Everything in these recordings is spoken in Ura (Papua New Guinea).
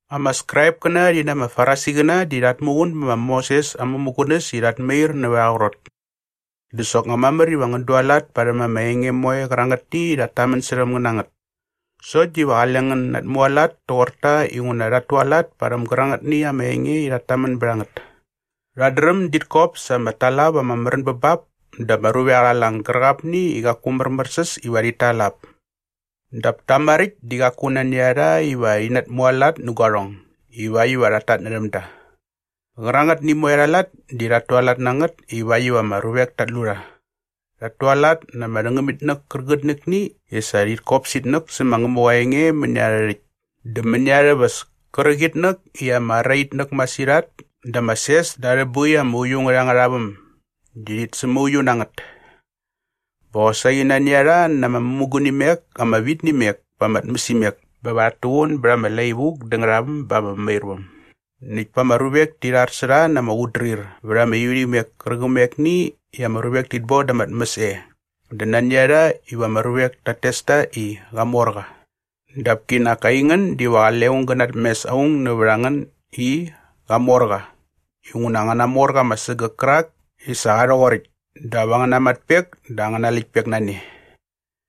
“Ama Skraipkäna rhi na ama Farisiqäna di rhat muqun bä ma Moses aa mämugunäs i rhat mair nävät aa qrot dä soknga mamär iva ngän dualat parhäm ama enge moe qärangätni i rhat tamän särhäm ngän na ngät. Sokt diva qale ngän natmualat toqor ta inguna qaku rhat tualat parhäm gärangätni ama enge i rhat tamän bät a ngät. “Rhat dräm dit kop sa ama talap ama märän bä bap da ama ruvek arha lang gärqapni i qaku märmärsäs iva rhit tal ap. Dap ta maräkt di qaku nani a rha iva rhi natmualat nä guarhong ivakt iva rhat tatnärhäm da. Qärangätni moe arha lat di rhat tualat na ngät ivakt iva ama ruvek tat lu rha. Rhat tualat na ama rhängämitnäk kärqitnäkni i sa rhit kop itnäk sä ma Ngämuqa aa enge mäni arhä rhäkt dä mäni arhä väs kärqitnäk i ama ara itnäk masirhat dä ama ses da arhä boi ama uiu ngät angärha väm di rhit sämauiu na ngät. Bä qosaqi nani a rha na ama mämugunimek ama vit nä imek pa ama tmäsimek bä va rhat tuqun bät ama lai vuk dä ngärhaväm ba ama mämairväm näkt pa ama ruvek ti rhar sä rha na ama qutdrir vät ama ivärhimek kärqämekni i ama ruvek tit boda arha tmäs e dä nani a rha iva ama ruvek tat tes ta i, ‘Qamorqa.’ “Dap kinak aingän diva qale aung gä natmes aung nävät a ngän i, ‘Qamorqa’ inguna angäna morqa ama sägäk kärak i sa qa rhoqoräkt dap angäna matpek dä angäna läktpek na ne.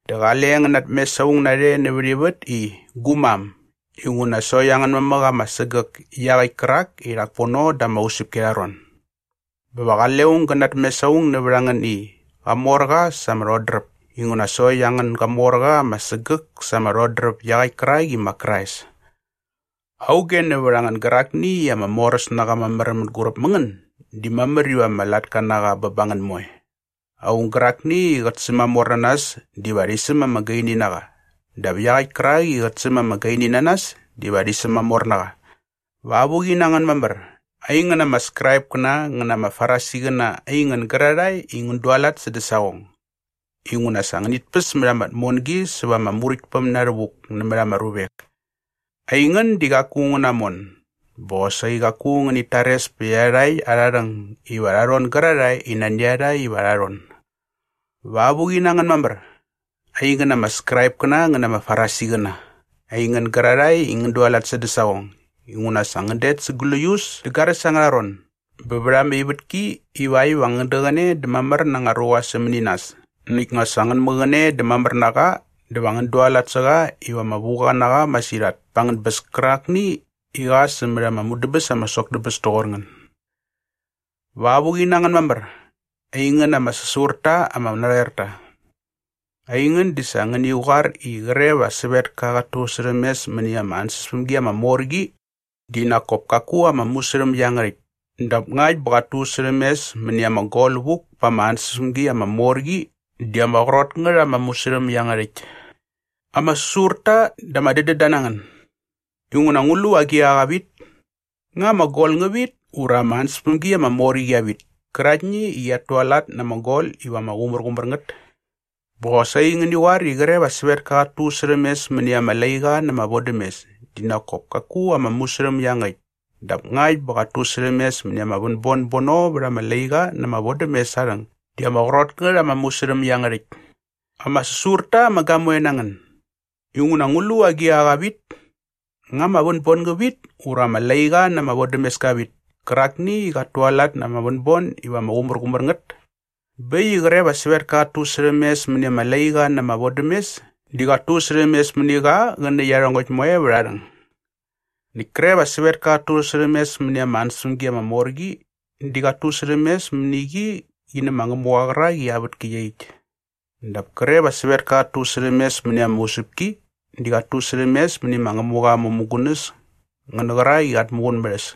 Dä qale ngän natmes aung narhe nävät ivät i, ‘Gu mam’ inguna sokt angän mamäk ama sägäk iaqäkt kärak i rhak pono da ama usäpki arha ron. Bä va qale aung gä natmes aung nävät a ngän i, ‘Qamorqa sa ama rhodräp’ inguna sokt angän gamorqa ama sägäk sa ama rhodräp iaqäkt kärak i ma Krais. Auge nävät a ngän gärakni i ama moräs na qa mamär mänguräp mä ngän di mamär iva ama latka na qa bä ba ngän moe. Aung gärakni i qät sämamor na nas diva rhi säm ama gaini na qa dap iaqäkt kärak i qät säm ama gaini na nas diva rhi sämamor na qa. “Va avuqi na ngän mamär, aingän ama Skraipkäna ngän na ama Farisiqäna aingän gärarhae i ngän dualat sädä saqong, inguna sa ngänit päs mät ama tmongi säva ama Muräktpäm na rhävuk nämät ama ruvek. Aingän di qaku ngän namon bä qosaqi qaku ngänit tares pät iarhakt arha rhäng iva rha rhon gärarhae i nani a rha iva rha rhon. “Va avuqi na ngän mamär, aingän ama Skraipkäna ngän na ama Farisiqäna, aingän gärarhae i ngän dualat sädä saqong, inguna sa ngän det sa gläius dä garäs angärha ron bä vät ama ivätki ivakt iva ngän däqäne dä mamär na anga ruqa sämäni nas näkt nga sa ngän mäqäne dä mamär na qa dä va ngän dualat sä qa iva ama vuqa na qa masirhat pa angän bäs kärakni iva qa sämät ama mudäbäs ama sok tä bäs toqor ngän. “Va avuqi na ngän mamär, aingän ama säsur ta ama narhoerta. Aingän di sa ngäni qoar i qre va sävetka qat tusärhämes mäni ama ansäspämgi ama mor qi di nak kop kaku ama musärhäm iangärhäkt dap ngakt bä qat tusärhämes mäni ama gol vuk pa ama ansäspämgi ama mor qi di ama qrot ngät ama musärhäm iangärhäkt. Ama säsur ta dä ama dädända na ngän! Inguna ngu lu agiqa qa vit? Nga ama gol ngä vit ura ama ansäspämgi ama mor qi qia vit käraktni i qiat tualat na ama gol iva ama qumärqumär ngät? “Bä qosaqi ngäni qoar i qre va sävetka qat tusärhämes mäni ama laiqa na ama vodämes di nak kop kaku ama musärhäm iangärhäkt dap ngakt bä qat tusärhämes mäni ama vänbon bono vät ama laiqa na ama vodämes aa rhäng di ama qrot ngät ama musärhäm iangärhäkt. Ama säsur ta ama gamoe na ngän! Inguna ngu lu agiqa qa vit? Nga ama vänbon ngä vit ura ama laiqa na ama vodämes ka vit kärakni i qat tualat na ama vänbon iva ama qumärqumär ngät? Bä äkt i qre va sävetka qat tusärhämes mäni ama laiqa na ama vodämes di qat tusärhämes mäni qa qä nä iarhongäkt moe vät aa rhäng. Näkt kre va sävetka qat tusärhämes mäni ama ansäspämgi ama mor qi di qat tusärhämes mäni qi qi nä ma Ngämuqa qärak i aa vätki iaqyäkt. Dap kre va sävetka qat tusärhämes mäni ama usäpki di qat tusärhämes mäni ma Ngämuqa aa mämugunäs ngä nä qärak i qat muqun mät a äs.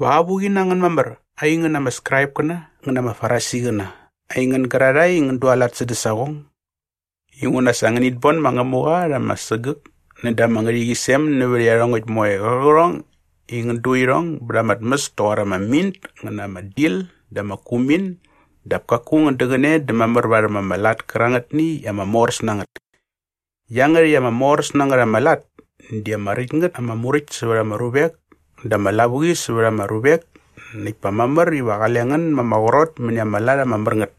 “Va avuqi na ngän mamär aingän ama Skraipkäna ngän na ama Farisiqäna aingän gärarhae i ngän dualat sädä saqong, inguna sa ngänit bon ma Ngämuqa rha ama sägäk näda ama ngärhäqyisem nävät iarhongäkt moe qärqärhong i ngän du irhong bät ama tmäs toqor ama mint ngä na ama dil dä ama kumin dap kaku ngän däqäne dä mamär varhäm ama lat kärangätni i ama moräs na ngät. Iangärhäkt ama moräs na ngät ama lat di ama räkt ngät ama muräkt sävät ama ruvek dä ama lavuqi sävät ama ruvek näkt pa mamär iva qale ngän ma ama qrot mäni ama lat ama mär ngät.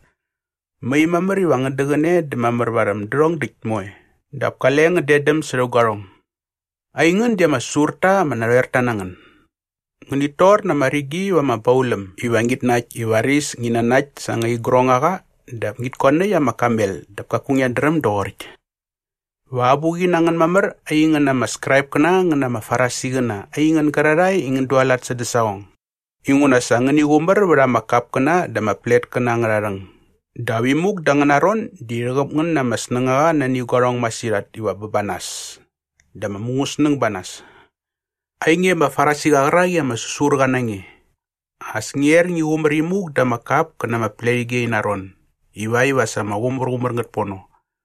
Mai mamär iva ngän däqäne dä mamär varhäm därhong däkt moe dap kale ngän detdäm särhä guarhong. Aingän di ama säsur ta ama narhoerta na ngän! Ngänit tor na ama rigi va ama bauläm iva ngit nakt i varis ngi nanakt sa anga igrongaqa dap ngit koanäkt ama kamel dap kaku ngiat dräm doqoräkt. “Va avuqi na ngän mamär aingän ama Skraipkäna ngän na ama Farisiqäna aingän gärarhae i ngän dualat sädä saqong, inguna sa ngäni qumär vät ama kapkäna dä ama pletkäna angärha rhäng dap imuk da angäna ron di rhäqäp ngän na ama snängaqa nani ama qärhong masirhat iva bä ba nas dä ama mungäsnäng ba nas. Ainge ama Farisiqa qärak i ama säsur qa na nge! As ngia er ngi qumär imuk da ama kap kä na ama pletige ina ron ivakt iva sa ama qumärqumär ngät pono.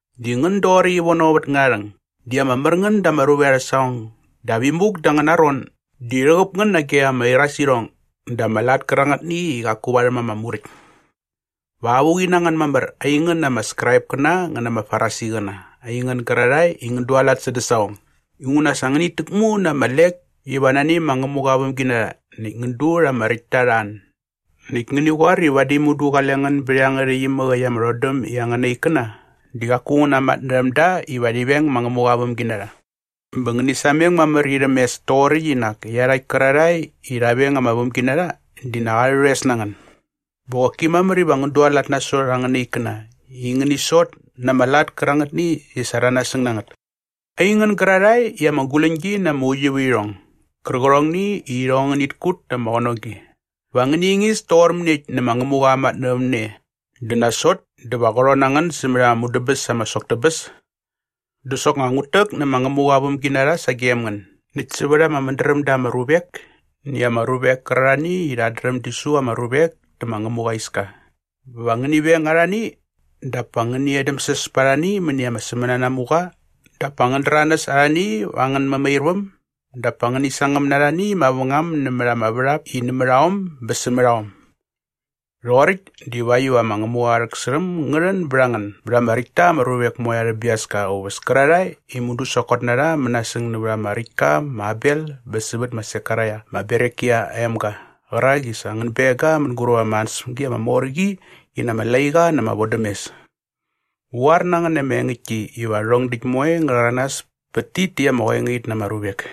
Di ngän doqoräkt ivono vät ngärharhäng di ama mär ngän da ama ruvek arhä saqong dap imuk da angäna ron di rhäqäp ngän nage ama irasirhong dä ama lat kärangätni i qaku varhäm ama Muräkt. “Va avuqi na ngän mamär aingän ama Skraipkäna ngän na ama Farisiqäna aingän gärarhae i ngän dualat sädä saqong, inguna sa ngänit täkmu na ama lek iva nani ma Ngämuqa aa vämginarha näkt ngän du rha ama räktta arha an näkt ngäni qoar i vadi mudu qale ngän bät iangärhäkt imäk äkt ama rhodäm i angäna ikkäna di qaku ngän namatnärhäm da iva rhi veng ma Ngämuqa aa vämginarha. Bä ngäni sameng mamär irhäm mes toqoräkt i nak iarhakt kärarhae i rha veng ama vämginarha di nak arhä rhoes na ngän. Bä qoki mamär iva ngän dualat nasot angäna ikkäna i ngäni sot na ama lat kärangätni i sa rha nasäng na ngät. Aingän gärarhae i ama guläñgi na ama uiuvärhirhong gärqärhongni i irhong ngärhit kut na ama qänogi, va ngäni ingis toqor mäniekt nä ma Ngämuqa aa matnävämne dä nasot dä va qä rhon na ngän sämät ama mudäbäs ama sok tä bäs? “Dä soknga ngut täk nä ma Ngämuqa aa vämginarha sagem ngän näkt sävät ama mädräm da ama ruvek näkt ama ruvek kärarhani i rhat dräm di su ama ruvek tä ma Ngämuqa aa iska bä va ngäni veng arhani dap pa ngäni edämsäs pät arhani mäni ama sämänanamuqa dap pa ngän däranäs arhani va angän mämairväm dap pa ngäni sangäm na arhani mavängam nämät ama värhap i nämät aom bä sämät aom. Rhoqoräkt divakt iva ma Ngämuqa aa rhäksärhäm ngä rhän bät a ngän bät ama räkt ta ama ruvek moe arhä biaska aa uväs kärarhae i mudu sokot na rha mänasäng nävät ama räkt ka ma Abel bä sävät ma Sekaraia ma Berekia aa emga qärak i sa ngän beng ga mänguräp ama ansäspämgi ama mor qi qi na ama laiqa na ama vodämes. Ngu qoar na ngän na ama engäktki iva rhärhong däkt moe ngä rhäranas pät tit täkt ama qoengait na ama ruvek.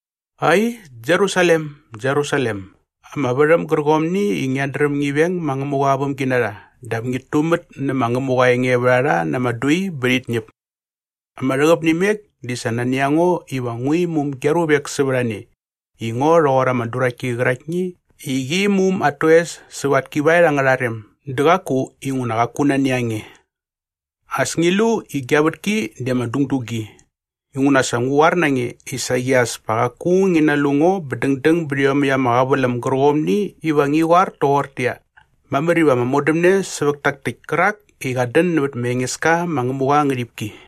“Ai, Jerusalem, Jerusalem, ama värhäm gärqomni i ngiat dräm ngi veng ma Ngämuqa aa vämginarha dap ngit tumät nä ma Ngämuqa aa engevärharha na ama dui bä rhit ñäp. Ama rhäqäp nä imek di sa nani a ngo iva ngu imum gia ruvek sävät a ne i ngo rhoqor ama duraktki qäraktni i qi imum at toes säva at kivaet angärha rem dä qaku inguna qaku nani a nge. As ngi lu i gia vätki di ama dungdu gi. Inguna sa ngu qoar na nge i saqi as pa qaku ngi nalu ngo bä dängdäng bät iomäkt ama qäväläm gärqomni iva ngi qoar toqortäqyia, ‘Mamär iva ama modämne sävät tak täkt kärak i qat dän nävät ma Engeska ma Ngämuqa aa ngärhipki.’”